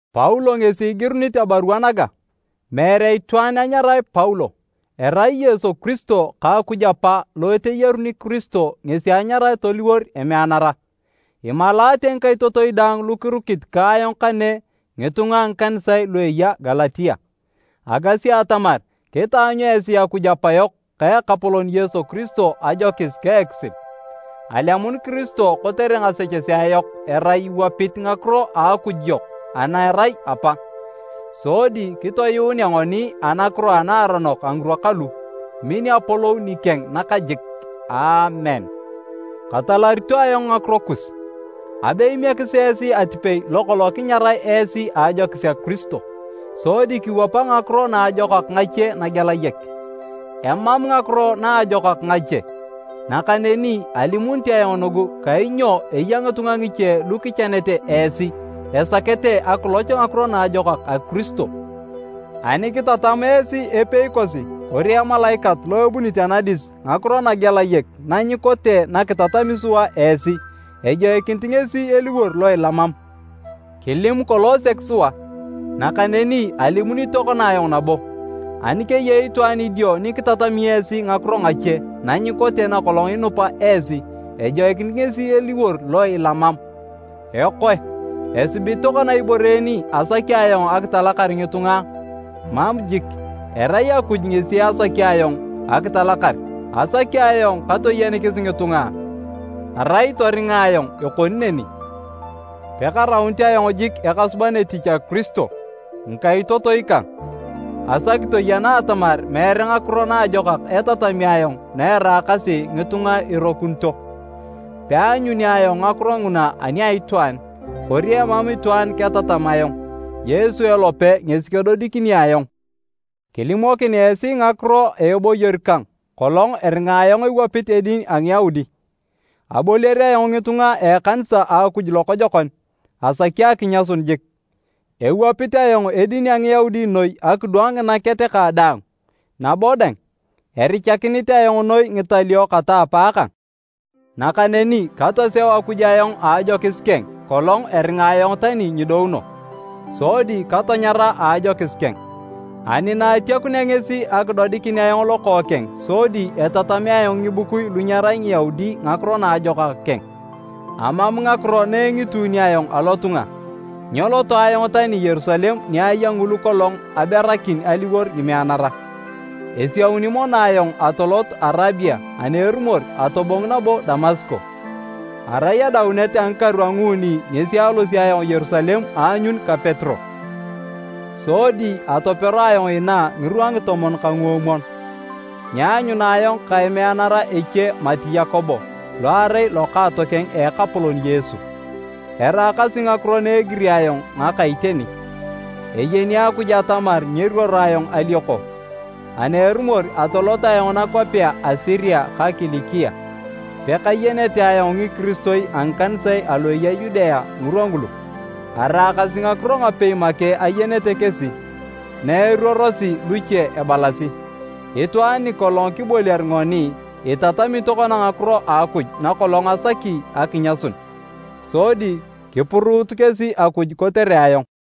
Paulo ngesi igirunit abarua naga, meere itwaan anyarae Paulo. Erai Yesu Kiristo ka Akuj Apa lo eteyaruni Kiristo ngesi anyarae toliwor emeanara. Imalaate ngikaitotoi daang lu kirukit ka ayong kane ngitunga a ngikanisae lu eya Galatia. Agasi atamar kitaanyu esi Akuj Apayok ka Ekapolon Yesu Kiristo ajokis ka ekisil. Alemun Kiristo kotere ngasechesea yok erai iwapit ngakiro a Akuj yok ana erai Apa, sodi kitoyuunea ngoni anakiro anaaronok a ngirwa kalu. Min apolou nikeng nakajik! Aamen. Katalarito ayong ngakiro kus! Abe imiekis esi atipei lokolong kinyarae esi a ajokis a Kiristo, sodi kiwapa ngakiro naajokak ngache nagelayek. Emam “ngakiro naajokak ngache,” nakaneni alimunit ayong nugu kainyo eya ngitunga ngiche lu kichanete esi esakete akiloch ngakiro naajokak a Kiristo. Ani kitatam esi epei kosi kori emalaikat lo ebunit anadis ngakiro nagelayek na nyikote na kitatami sua esi, ejoikinit ngesi eliwor lo ilamam! Kilimu kolong sek sua, nakaneni alimunit tokona ayong nabo, ani keyei itwaan idio ni kitatami esi ngakiro ngache na nyikote nakolong inupa esi, ejoikinit ngesi eliwor lo ilamam! Ekoe, esibit tokona ibore en asaki ayong akitalakar ngitunga a? Mam jik! Erai Akuj ngesi asaki ayong akitalakar! Asaki ayong katoyenikis ngitunga a? Arai atoringa ayong ekoni neni, pekaraunit ayong jik ekasuban etich a Kiristo. Ngikaitotoi kang, asaki toyena atamar meere ngakiro naajokak etatami ayong na eraakasi ngitunga irokunito. Peanyuni ayong ngakiro nguna ani a itwaan, kori emam itwaan ketatam ayong. Yesu elope ngesi kedodikini ayong. Kilimokin esi ngakiro a eboyor kang kolong eringa ayong ewapit edin a Ngiyaudi. Aboliar ayong ngitunga a ekanisa a Akuj lokojokon, asaki akinyasun jik. Ewapit ayong edin a Ngiyaudi noi akidwang nginaket kang daang, nabo dang, erichakinit ayong noi ngitalio kata apaakang. Nakaneni katoseu Akuj ayong a ajokis keng kolong eringa ayong tani nyidouno. Sodi katanyara a ajokis keng ani naatiakunea ngesi akidodikin ayong Lokookeng sodi etatamea ayong ngibukui lu nyerai Ngiyaudi Ngakiro Naajokak keng, amam ngakiro engituuni ayong alotunga. Nyeloto ayong tani Yerusalem ni aya ngulu kolong aberakin aliwor ngimeanara. Esiauni mono ayong atolot Arabia ani erumor atobong nabo Damasko. Arai adaunet a ngikaru a nguuni ngesi alosio ayong Yerusalem aanyun ka Petero, sodi atopero ayong inaa ngirwa ngitomon ka nguomwon. Nyeanyuna ayong ka emeanara eche mati Yakobo, lo erai lokaatokeng a Ekapolon Yesu. Eraakasi ngakiro na egiri ayong ngaka iteni. Eyeni Akuj atamar nyeruoro ayong alioko! Ani erumor atolot ayong nakwapea a Siria ka Kilikia. Pekayenete ayong ngikiristoi a ngikanisae alu aya Yudea ngirwa ngulu. Araakasi ngakiro ngapei make ayenete kesi, na eruorosi luche ebalasi, “Itwaan nikolong kiboliar ngoni, itatami tokona ngakiro a Akuj nakolong asaki akinyasun!” Sodi kipuruut kesi Akuj kotere ayong.